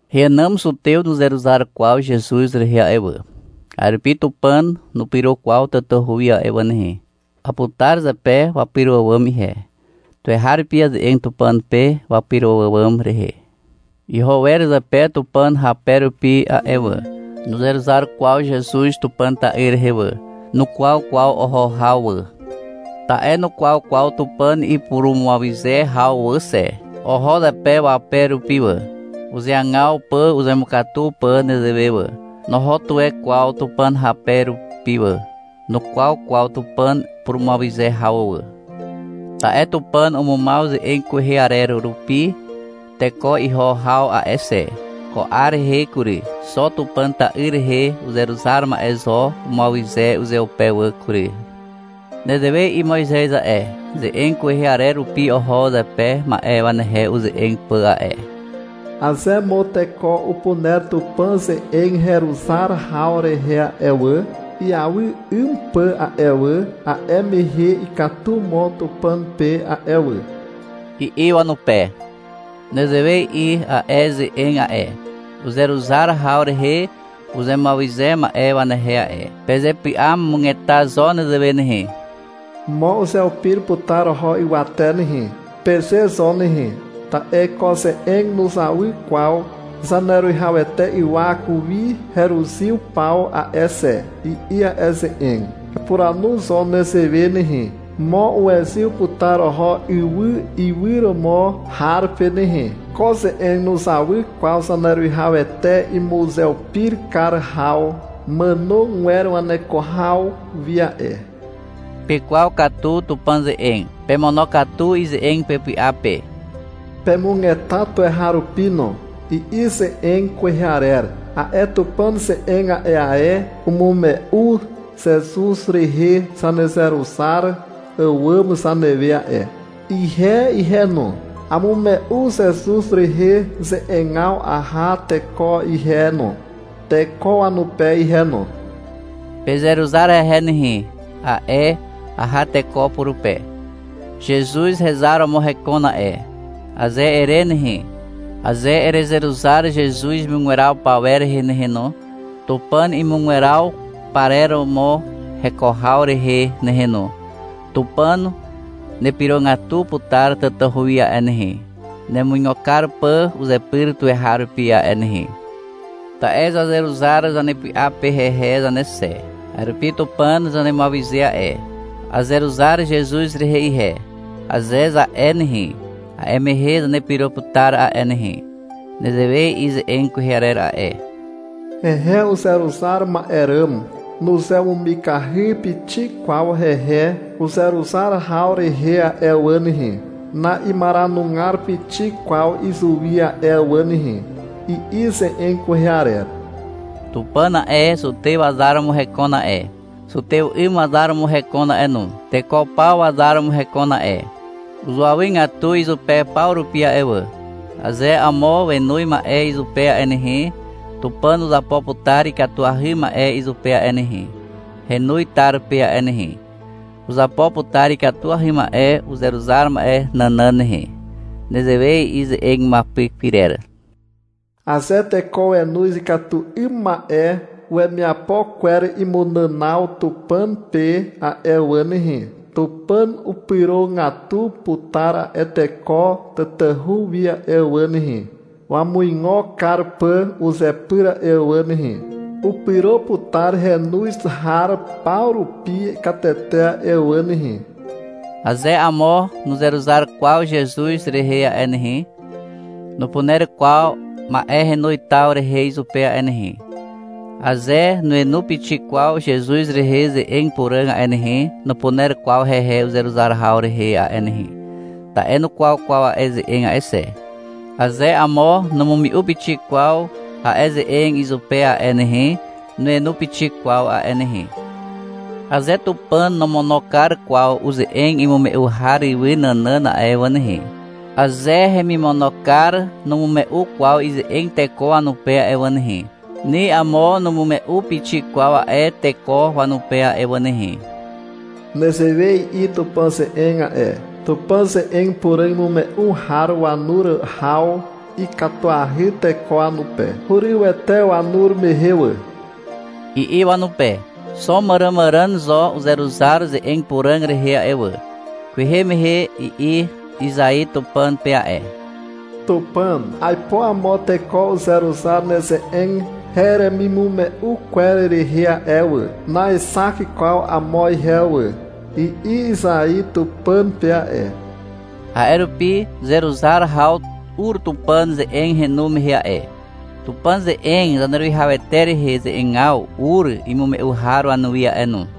Heànàm zutew nuzeruzar kwaw Zezuz rehe a'e wà. A'e rupi Tupàn nupyro kwaw tatahu wi a'e wà nehe. Aputar zepe wapyro àwàm ihe. Tuweharupi aze'eg Tupàn pe wapyro àwàm rehe. Iho wer zepe Tupàn hape rupi a'e wà. (Nuzeruzar kwaw Zezuz Tupàn ta'yr rehe wà.) Nukwaw kwaw oho haw wà. Ta'e nukwaw kwaw Tupàn ipurumuawyze haw wà xe. Oho zepe wape rupi wà, uzeagaw pà uzemukatu pà nezewe wà. Noho tuwe kwaw Tupàn hape rupi wà, nukwaw kwaw Tupàn purumuawyze haw wà. Ta'e Tupàn umumaw ze'eg kwehe arer rupi teko iho haw a'e xe. Ko 'ar rehe kury, xo Tupàn ta'yr rehe uzeruzar ma'e zo umuawyze uzeupe wà kury. Nezewe i'i Moizez a'e, ze'eg kwehe arer rupi oho zepe ma'e wanehe uze'eg pà a'e. — Aze mo teko upuner Tupàn ze'eg heruzar haw rehe a'e wà, iawy 'ym pà a'e wà, a'e mehe ikatu mo Tupàn pe a'e wà, i'i wanupe. Nezewe i'i a'e ze'eg a'e, uzeruzar haw rehe uzemuawyze ma'e wanehe a'e. — Pezepy'amugeta zo nezewe nehe. Mo uzeupir putar oho ywate nehe, peze zo nehe. Ta'e ko ze'eg nuzawy kwaw Zaneruwihawete ywak wi heruzyw paw a'e xe, i'i a'e ze'eg. Epuranu zo nezewe nehe. — Mo uwezyw putar oho ywy iwyromo har pe nehe. Ko ze'eg nuzawy kwaw Zaneruwihawete imuzeupir kar haw màno gwer waneko haw wi a'e. — Pekwaw katu Tupàn ze'eg. Pemonokatu ize'eg pepy'a pe. Pemugeta tuweharupi no, i'i ze'eg kwehe arer. A'e Tupàn ze'eg a'e ae umume'u Zezuz rehe zanezeruzar àwàm zanewe a'e. Ihe ihe no, amume'u Zezuz rehe ze'egaw aha teko ihe no, teko wanupe ihe no. — Pezeruzar hehe nehe, a'e aha teko purupe. — Zezuz hezar romo hekon a'e, aze ere nehe, aze erezeruzar Zezuz imugweraw pawer rehe nehe no, Tupàn imugweraw parer romo heko haw rehe nehe no, Tupàn nepyrogatu putar tatahu wi a'e nehe, nemuigo kar pà uzepyr tuweharupi a'e nehe. Ta'e zazeruzar zanepy'a pe hehe zane xe. A'e rupi Tupàn zanemuawyze a'e. — Azeruzar Zezuz rehe ihe, aze za'e nehe, a'e mehe zanepyro putar a'e nehe. Nezewe i'i ze'eg kwehe arer a'e. — Hehe uzeruzar ma'e ràm nuzemumikahy pixik kwaw hehe uzeruzar haw rehe a'e wà nehe, na'imaranugar pixik kwaw izuwi a'e wà nehe, i'i ze'eg kwehe arer. Tupàn a'e, zutew wazar romo hekon a'e. Zutew 'ym wazar romo hekon a'e no. Teko paw wazar romo hekon a'e. Uzuawygatu izupe paw rupi a'e wà. Aze amo wenoz ma'e izupe a'e nehe, Tupàn uzapo putar ikatuahy ma'e izupe a'e nehe, henoz tar pe a'e nehe. Uzapo putar ikatuahy ma'e uzeruzar ma'e nànàn nehe. Nezewe i'i ze'eg imuapyk pyrer. — Aze teko wenoz ikatu 'ym ma'e wemiapo kwer imunànaw Tupàn pe a'e wà nehe, Tupàn upyrogatu putar a'e teko tatahu wi a'e wà nehe, wamuigo kar pà uzepyr a'e wà nehe. Upyro putar henoz har paw rupi katete a'e wà nehe. Aze amo nuzeruzar kwaw Zezuz rehe a'e nehe, nupuner kwaw ma'e henoz taw rehe izupe a'e nehe. Aze nuenu pixik kwaw Zezuz rehe ze'eg puràg a'e nehe, nupuner kwaw hehe uzeruzar haw rehe a'e nehe, ta'e nukwaw kwaw a'e ze'eg a'e xe. Aze amo numume'u pixik kwaw a'e ze'eg izupe a'e nehe, nuenu pixik kwaw a'e nehe. Aze Tupàn nomono kar kwaw uze'eg imume'u har ywy nànàn a'e wà nehe, aze hemimono kar numume'u kwaw ize'eg teko wanupe a'e wà nehe, ni amo numume'u pixik kwaw a'e teko wanupe a'e wà nehe. Nezewe i'i Tupàn ze'eg a'e. — Tupàn ze'eg puràg imume'u har wanur haw ikatuahy teko wanupe. Hurywete wanur mehe wà, i'i wanupe. Xo màràmàràn zo uzeruzar ze'eg puràg rehe a'e wà. Kwehe mehe i'i Izai Tupàn pe a'e. — Tupàn, aipo amo teko uzeruzar neze'eg heremimume'u kwer rehe a'e wà. Naexak kwaw amo ihe wà, i'i Izai Tupàn pe a'e. A'e rupi zeruzar haw ur Tupàn ze'eg henu mehe a'e, Tupàn ze'eg Zaneruwihawete rehe ze'egaw ur imume'u har wanuwi a'e no.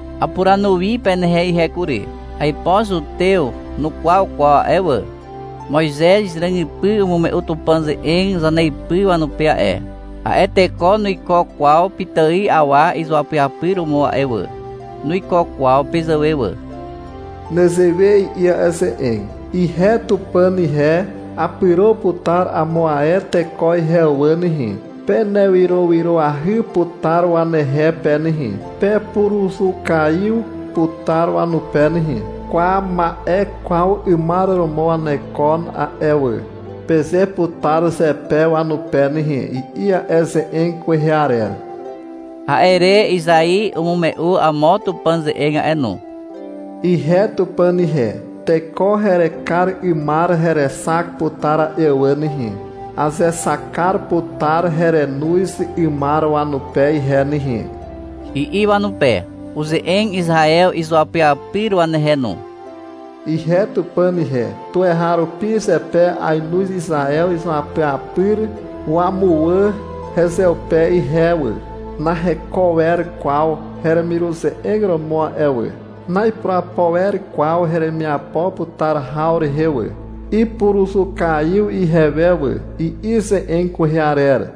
Apuranu wi penehe ihe kury. Aipo zutew nukwaw kwaw a'e wà. Moizez ràgypy umume'u Tupàn ze'eg zaneipy wanupe a'e. A'e teko nuiko kwaw pitài awa izuapyapyr romo a'e wà. Nuiko kwaw pezàwe wà. Nezewe i'i a'e ze'eg. — Ihe Tupàn ihe, apyro putar amo ae teko ihe wà nehe. Penewyrowyroahy putar wanehe pe nehe. Pepuruzukaiw putar wanupe nehe. — Kwa, ma'e kwaw 'ymar romo wanekon a'e wà, peze putar zepe wanupe nehe, i'i a'e ze'eg kwehe arer. A'e re Izai umume'u amo Tupàn ze'eg a'e no. — Ihe Tupàn ihe, teko herekar 'ymar herexak putar a'e wà nehe. Azexak kar putar herenoz 'ymar wanupe ihe nehe, i'i wanupe. Uze'eg Izaew izuapyapyr wanehe no. — Ihe Tupàn ihe, tuweharupi zepe ainoz Izaew izuapyapyr wamuwà hezeupe ihe wà. Naheko wer kwaw heremiruze'eg romo a'e wà. Na'ipurapo wer kwaw heremiapo putar haw rehe wà. Ipuruzukaiw ihewe wà, i'i ze'eg kwehe arer.